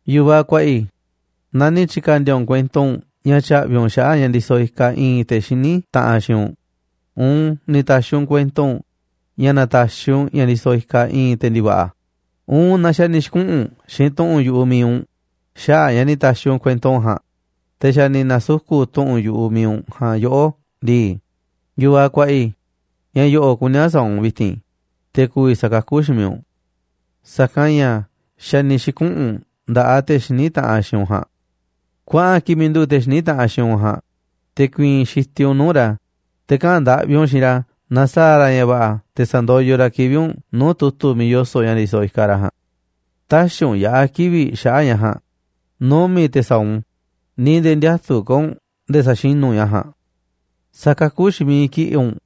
Yu̱vaꞌ kuaꞌa i̱, naaꞌ ni̱ tyi̱ka̱ndi̱a̱ u̱nꞌ kuento u̱nꞌ ña̱ tya̱ꞌvi̱ u̱nꞌ xaꞌa̱ꞌ ña̱ ndisoꞌ ikaꞌ i̱i̱n te̱ xiní taꞌanꞌ xiinꞌ u̱nꞌ, uun ni̱ ta̱xi̱ u̱nꞌ kuento u̱nꞌ ña̱ na̱ta̱xi̱ u̱nꞌ ña̱ ndisoꞌ ikaꞌ i̱i̱n te̱ ndi̱va̱ꞌa̱, uun naaꞌ xa̱ ni̱ xi̱kuꞌu̱n u̱nꞌ xiinꞌ tu̱ꞌu̱n yu̱ꞌuꞌ mi̱iꞌ u̱nꞌ xaꞌa̱ꞌ a̱ ña̱ ni̱ ta̱xi̱ u̱nꞌ kuento ja̱a̱nꞌ, te̱ xa̱ ni̱ na̱suku̱ꞌ tu̱ꞌu̱n yu̱ꞌuꞌ mi̱iꞌ u̱nꞌ ja̱a̱nꞌ yoꞌó ndii, yu̱vaꞌ kuaꞌa i̱, ña̱ yo̱ꞌo̱ꞌ kuní a̱ sa̱a̱ u̱nꞌ vi̱ti̱n, te̱ ku̱vi̱ sa̱kakú xiinꞌ miiꞌ u̱nꞌ. Sa̱kanꞌ ña̱ xa̱ ni̱ xi̱kuꞌu̱n u̱nꞌ nda̱ꞌaꞌ te̱ xiní taꞌanꞌ xiinꞌ u̱nꞌ ja̱a̱nꞌ. Kuaꞌan kiꞌi̱ꞌ miiꞌ nduꞌu̱ꞌ te̱ xiní taꞌanꞌ xiinꞌ u̱nꞌ ja̱a̱nꞌ, te̱ ku̱i̱i̱n xitiꞌ u̱nꞌ nuu̱ꞌ ra̱ te̱ kaꞌa̱n ndaꞌvi u̱nꞌ xiinꞌ ra̱ na sa̱a̱ ra̱ ña̱ va̱ꞌa̱ te̱ sa̱ndoyoꞌ ra̱ kivi̱ꞌ u̱nꞌ nuu̱ꞌ tu̱tu̱ miiꞌ yoso̱ꞌ ña̱ ndisoꞌ ikaꞌ ra̱ ja̱a̱nꞌ. Tä̱xi̱ u̱nꞌ yaꞌa̱ kivi̱ꞌ xaꞌa̱ꞌ ña̱ ja̱a̱nꞌ, numi̱ꞌ te̱ sa̱a̱ u̱nꞌ u̱n, ni̱ nde̱e̱ ndiätuꞌ ka̱ u̱nꞌ nde̱e̱ sa̱xinu̱ u̱nꞌ ña̱ ja̱a̱nꞌ. Sa̱kakú xiinꞌ miiꞌ kiꞌi̱ꞌ u̱nꞌ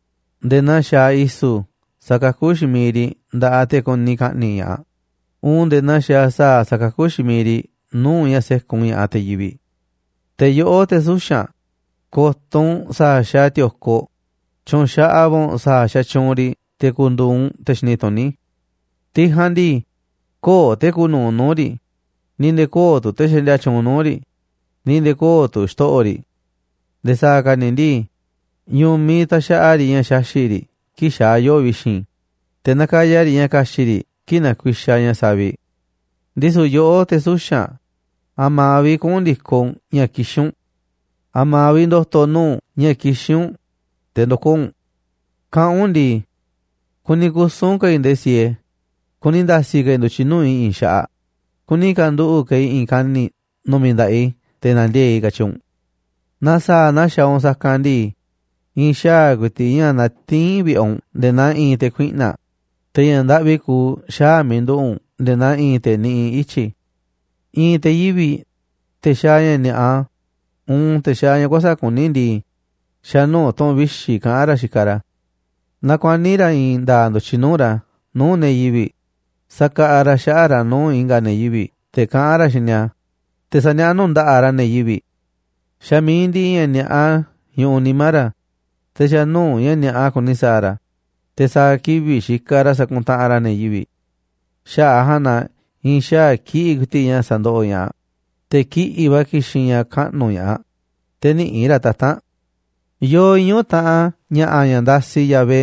nde̱e̱ naa xaaꞌ i̱su̱ sakakú xiinꞌ miiꞌ riꞌ nda̱ꞌaꞌ te̱ kuni ka̱ꞌni̱ꞌ ña̱ꞌaꞌ, uun nde̱e̱ naa xaaꞌ sa̱a̱ sa̱kakú xiinꞌ miiꞌ riꞌ nuu̱ꞌ ña̱ sékun ña̱ꞌaꞌ te̱ yivi̱ꞌ. Te̱ yoꞌó, te̱ suxa̱nꞌ, ko̱to̱ u̱nꞌ sa̱a̱ xaaꞌ ti̱o̱koꞌ, tyu̱u̱n xaꞌaꞌ va̱ u̱nꞌ sa̱a̱ xatyuunꞌ riꞌ te̱ ku̱ndu̱u̱ u̱nꞌ te̱ xini tuní. Tiꞌ ja̱a̱nꞌ ndii, köo̱ꞌ te̱ kuuꞌ nu̱uꞌ nuu̱ꞌ riꞌ, ni̱ nde̱e̱ köo̱ꞌ tu̱ te̱ xaꞌndia tyuunꞌ nuu̱ꞌ riꞌ, ni̱ nde̱e̱ köo̱ꞌ tu̱ xto̱ꞌo̱ riꞌ. Nde̱e̱ sa̱a̱ ka̱ ni̱ ndii, ñu̱miꞌ taxaꞌa riꞌ ña̱ xaxi̱ꞌ riꞌ kii̱ꞌ xaa̱ yoo̱ꞌ vi̱xi̱n, te̱ nakaya riꞌ ña̱ ka̱xi̱ꞌ riꞌ kii̱ꞌ nakuixaꞌ ña̱ saviꞌ. Ndisu̱ yoꞌó, te̱ suxa̱nꞌ, ¿a̱ma̱a̱ vi̱ꞌ kuꞌu̱n ndi̱koꞌ u̱nꞌ ña̱ kixín u̱nꞌ? ¿A̱ma̱a̱ vi̱ꞌ ndo̱to̱ nuu̱ꞌ u̱nꞌ ña̱ kixín u̱nꞌ, te̱ ndo̱koo̱ u̱nꞌ? Kaꞌán u̱nꞌ ndii: “Kuni kusu̱n ka̱ i̱ nde̱e̱ siee, kuni nda̱si̱ ka̱ i̱ ndu̱tyiꞌ nuu̱ꞌ i̱ i̱i̱n xaꞌaꞌ, kuni ka̱nduꞌu̱ꞌ ka̱ i̱ i̱i̱n kani̱ꞌ nu̱mi̱ nda̱ꞌaꞌ i̱ te̱ na̱ndiee̱ꞌ i̱”, katyi u̱nꞌ. Naaꞌ sa̱a̱ naa xaaꞌ u̱nꞌ sa̱kanꞌ ndii, i̱i̱n xaa̱ ku̱i̱ti̱ꞌ ña̱ natiín vi̱ꞌe̱ u̱nꞌ nde̱e̱ naa i̱i̱n te̱ kuiꞌna̱ꞌ, te̱ ña̱ ndaꞌvi kuuꞌ xaa̱ miiꞌ nduꞌu̱ꞌ u̱nꞌ nde̱e̱ naa i̱i̱n te̱ niꞌiꞌ ityi̱. I̱i̱n te̱ yivi̱ꞌ, te̱ xaaꞌ ña̱ ni̱a̱ꞌa, uun te̱ xaaꞌ ña̱ kuäsa̱ꞌ kuní ndii, xa̱ nuu̱ꞌ tu̱ꞌu̱n vixi̱ kaꞌán ra̱ xikaꞌ ra̱. Nakuaní ra̱ i̱i̱n nda̱a̱ꞌ ndu̱tyiꞌ nuu̱ꞌ ra̱ nuu̱ꞌ ne̱ yivi̱ꞌ sakaꞌaꞌ ra̱ xaꞌa̱ꞌ ra̱ nuu̱ꞌ i̱nga̱ ne̱ yivi̱ꞌ te̱ kaꞌán ra̱ xiinꞌ ni̱a̱, te̱ saniaꞌá nuu̱ꞌ nda̱ꞌaꞌ ra̱ ne̱ yivi̱ꞌ. Xa̱ mi̱iꞌ ndiꞌiꞌ ña̱ ni̱a̱ꞌa ñuꞌuꞌ nimá ra̱, te̱ xa̱ nuu̱ꞌ ña̱ ni̱a̱ꞌa kuni sa̱a̱ ra̱, te̱ sa̱a̱ kivi̱ꞌ xikaꞌ ra̱ sakuntaꞌanꞌ ra̱ ne̱ yivi̱ꞌ. Xaꞌa̱ꞌ a̱ ja̱a̱nꞌ na i̱i̱n xaa̱ kiꞌi̱ꞌ ku̱i̱ti̱ꞌ ña̱ sa̱ndoꞌoꞌ ña̱ꞌaꞌ, te̱ kiꞌi̱ꞌ va̱ ki̱xi̱n ña̱ kaꞌnu̱ ña̱ꞌaꞌ, te̱ nïꞌi̱ꞌ ra̱ tata̱nꞌ a̱. Yoo iñu̱ taꞌan ña̱ꞌa̱ ña̱ ndasiꞌ Yahvé,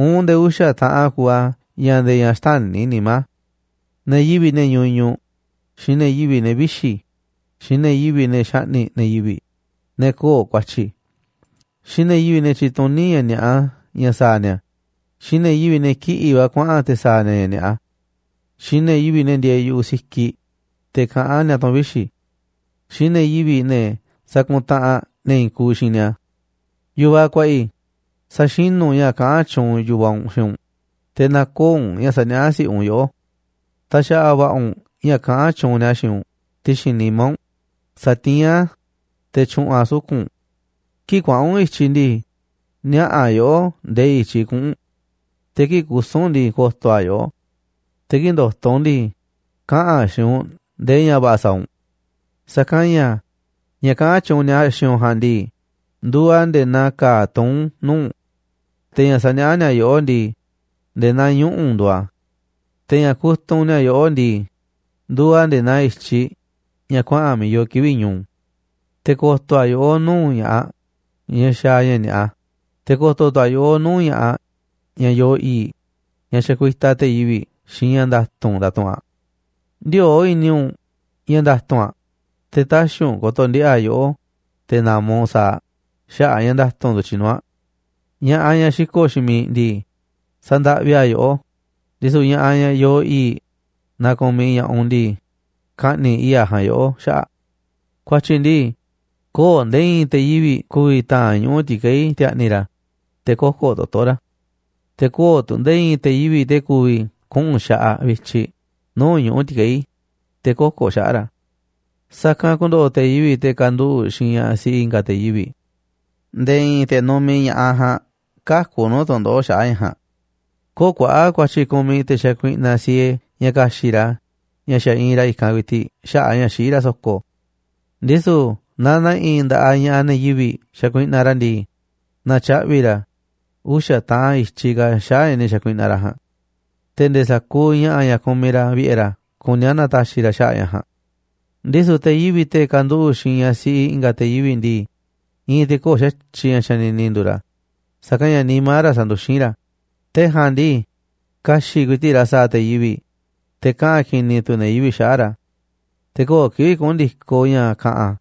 uun nde̱e̱ uxa̱ taꞌan kuuꞌ a̱ ña̱ nde̱e̱ ña̱ xtäni̱ nimá a̱: ne̱ yivi̱ꞌ, ne̱ ñuñuꞌ, xiinꞌ ne̱ yivi̱ꞌ, ne̱ vixi̱, xiinꞌ ne̱ yivi̱ꞌ, ne̱ xaꞌni̱ꞌ ne̱ yivi̱ꞌ ne̱ köo̱ꞌ ku̱a̱tyi̱, xiinꞌ ne̱ yivi̱ꞌ, ne̱ tyituní ña̱ ni̱a̱ꞌa ña̱ sa̱a̱ ni̱a̱, xiinꞌ ne̱ yivi̱ꞌ, ne̱ kiꞌi̱ꞌ va̱ kuaꞌa̱n te̱ sa̱a̱ ni̱a̱ ña̱ ni̱a̱ꞌa, xiinꞌ ne̱ yivi̱ꞌ, ne̱ ndieeꞌ yu̱ꞌuꞌ sikiꞌ, te̱ kaꞌán ni̱a̱ tu̱ꞌu̱n vixi̱, xiinꞌ ne̱ yivi̱ꞌ, ne̱ sakuntaꞌanꞌ ne̱ i̱i̱n kuuꞌ xiinꞌ ni̱a̱. Yu̱vaꞌ kuaꞌa i̱, sa̱xinu̱ u̱nꞌ ña̱ kaꞌán tyuunꞌ yu̱vaꞌ u̱nꞌ xiinꞌ u̱nꞌ, te̱ nä̱ko̱o̱ u̱nꞌ ña̱ saniaꞌá si̱ꞌiꞌ u̱nꞌ yoꞌó. Ta̱xa̱ꞌa̱ va̱ꞌa̱ u̱nꞌ ña̱ kaꞌán tyuunꞌ ni̱a̱ xiinꞌ u̱nꞌ ti̱xi̱n nimá u̱nꞌ. Sa̱tiín a̱ te̱ tyu̱ꞌu̱n a̱ suku̱nꞌ u̱nꞌ. Kii̱ꞌ kuaꞌa̱n u̱nꞌ i̱tyiꞌ ndii, niaꞌa̱ a̱ yoꞌó ndee i̱tyiꞌ kuꞌu̱n u̱nꞌ. Te̱ kii̱ꞌ kusu̱n u̱nꞌ ndii, ko̱to̱ a̱ yoꞌó. Te̱ kii̱ꞌ ndo̱to̱ u̱nꞌ ndii, kaꞌa̱n a̱ xiinꞌ u̱nꞌ ndee ña̱ va̱ꞌa̱ sa̱a̱ u̱nꞌ. Sa̱kanꞌ ña̱ ña̱ kaꞌán tyuunꞌ ni̱a̱ xiinꞌ u̱nꞌ ja̱a̱nꞌ ndii, nduuꞌ a̱ nde̱e̱ naa ka̱a̱ tuún nuu̱ꞌ u̱nꞌ. Te̱ ña̱ saniaꞌá ni̱a̱ yoꞌó ndii, nde̱e̱ naa ñuꞌu̱ nduuꞌ a̱. Te̱ ña̱ kutunꞌ ni̱a̱ yoꞌó ndii, nduuꞌ a̱ nde̱e̱ naa i̱tyiꞌ ña̱ kuaꞌa̱n miiꞌ yoo kivi̱ꞌ ñu̱u̱. Te̱ ko̱to̱ a̱ yoꞌó nuu̱ꞌ ña̱ꞌaꞌ ñaꞌ xaaꞌ ña̱ ni̱a̱ꞌa, te̱ ko̱to̱ tu̱ a̱ yoꞌó nuu̱ꞌ ña̱ꞌaꞌ ñaꞌ yoo i̱i̱ꞌ, ñaꞌ xakuitaꞌ te̱ yivi̱ꞌ xiinꞌ ña̱ nda̱tu̱nꞌ ndatuꞌunꞌ aꞌ. Ndiöo̱ꞌ i̱ni̱ u̱nꞌ ña̱ nda̱tu̱nꞌ aꞌ, te̱ tä̱xi̱ u̱nꞌ ko̱to̱ ndiꞌe̱ꞌ aꞌ yoꞌó te̱ na̱ma̱ u̱nꞌ sa̱a̱ aꞌ xaꞌa̱ꞌ a̱ ña̱ nda̱tu̱nꞌ ndu̱tyiꞌ nuu̱ꞌ aꞌ. Ña̱ꞌaꞌ, ñaꞌ xiko̱ꞌ xiinꞌ miiꞌ ndii, sa̱ndaꞌvi aꞌ yoꞌó, ndisu̱ ña̱ꞌaꞌ ñaꞌ yoo i̱i̱ꞌ naaꞌ ku̱miꞌ ña̱ꞌaꞌ u̱nꞌ ndii, ka̱ꞌni̱ꞌ i̱i̱ꞌ aꞌ ja̱a̱nꞌ yoꞌó xaꞌa̱ꞌ aꞌ. Ku̱a̱tyi̱ ndii, köo̱ꞌ nde̱e̱ i̱i̱n te̱ yivi̱ꞌ ku̱vi̱ ta̱a̱nꞌ ñuꞌu̱ ti̱keí ti̱a̱ꞌni̱ ra̱, te̱ kö̱ko̱ toto̱ ra̱. Te̱ köo̱ꞌ tu̱ nde̱e̱ i̱i̱n te̱ yivi̱ꞌ te̱ ku̱vi̱ kuꞌu̱n xaꞌaꞌ vityiꞌ nuu̱ꞌ ñuꞌu̱ ti̱keí, te̱ kö̱ko̱ xaꞌa̱ꞌ ra̱. Sa̱kanꞌ ku̱ndo̱ꞌo̱ te̱ yivi̱ꞌ, te̱ kanduꞌu̱ꞌ xiinꞌ ñaꞌ siꞌi i̱nga̱ te̱ yivi̱ꞌ. Nde̱e̱ i̱i̱n te̱ numiꞌ ña̱ꞌaꞌ ja̱a̱nꞌ käku̱ nuu̱ꞌ tu̱ndoꞌo̱ꞌ xaꞌa̱ꞌ ñaꞌ ja̱a̱nꞌ. Köo̱ kuaꞌa̱ꞌ ku̱a̱tyi̱ kumiꞌ te̱ xakuiꞌna siee ña̱ ka̱xi̱ꞌ ra̱ ña̱ xa̱ iinꞌ ra̱ i̱kanꞌ ku̱i̱ti̱ꞌ xaꞌa̱ꞌ a̱ ña̱ xiꞌí ra̱ so̱ko̱. Ndisu̱ naaꞌ ne̱ꞌi̱ nda̱ꞌaꞌ ña̱ꞌaꞌ ne̱ yivi̱ꞌ xakuiꞌnaꞌ ra̱ ndii, na̱tyaꞌvi̱ ra̱ uxa̱ taꞌan i̱tyiꞌ ka̱ xaꞌa̱ꞌ ña̱ ni̱ xa̱kuiꞌnaꞌ ra̱ ja̱a̱nꞌ. Te̱ nde̱e̱ sa̱kuuꞌ ña̱ꞌa̱ ña̱ kumiꞌ ra̱ vi̱ꞌe̱ ra̱ kuní a̱ na̱ta̱xi̱ ra̱ xaꞌa̱ꞌ ña̱ ja̱a̱nꞌ. Ndisu̱ te̱ yivi̱ꞌ, te̱ kanduꞌu̱ꞌ xiinꞌ ñaꞌ siꞌi i̱nga̱ te̱ yivi̱ꞌ ndii, i̱i̱n te̱ köo̱ꞌ xa̱tyiꞌ ña̱ xanini nduuꞌ ra̱, sa̱kanꞌ ña̱ nimá ra̱ sanduxín ra̱. Te̱ ja̱a̱nꞌ ndii, ka̱xi̱ꞌ ku̱i̱ti̱ꞌ ra̱ sa̱a̱ te̱ yivi̱ꞌ, te̱ kaꞌa̱n ki̱ni̱ tu̱ ne̱ yivi̱ꞌ xaꞌa̱ꞌ ra̱. Te̱ köo̱ꞌ kivi̱ꞌ kuꞌu̱n ndi̱koꞌ ña̱ ka̱ꞌa̱n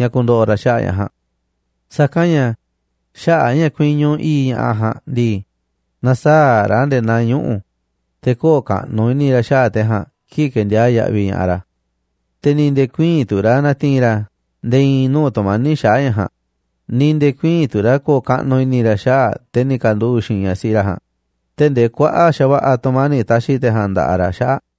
ña̱ ku̱ndo̱ꞌo̱ ra̱ xaꞌa̱ꞌ ña̱ ja̱a̱nꞌ. Sa̱kanꞌ ña̱ xaꞌa̱ꞌ a̱ ña̱ kuiñu i̱i̱ꞌ ña̱ꞌaꞌ ja̱a̱nꞌ ndii, na̱saa̱ꞌ ra̱ nde̱e̱ naa ñuꞌu̱, te̱ köo̱ꞌ kaꞌnuꞌ i̱ni̱ ra̱ xaꞌa̱ꞌ te̱ ja̱a̱nꞌ kii̱ꞌ ke̱ndiaa̱ꞌ yaꞌviꞌ ña̱ꞌaꞌ ra̱. Te̱ ni̱ nde̱e̱ ku̱ï̱i̱n tu̱ ra̱ na̱ti̱i̱n ra̱ nde̱e̱ i̱i̱n nuu̱ꞌ tu̱mani̱ꞌ xaꞌa̱ꞌ ña̱ ja̱a̱nꞌ, ni̱ nde̱e̱ ku̱ï̱i̱n tu̱ ra̱ ko̱o̱ kaꞌnuꞌ i̱ni̱ ra̱ xaꞌa̱ꞌ te̱ ni̱ ka̱nduꞌu̱ꞌ xiinꞌ ñaꞌ siꞌi ra̱ ja̱a̱nꞌ, tee̱ꞌ ndee kuaꞌa̱ꞌ xa̱va̱ꞌa̱ tu̱mani̱ꞌ ta̱xi̱ te̱ ja̱a̱nꞌ nda̱ꞌaꞌ ra̱ xaꞌa̱ꞌ aꞌ.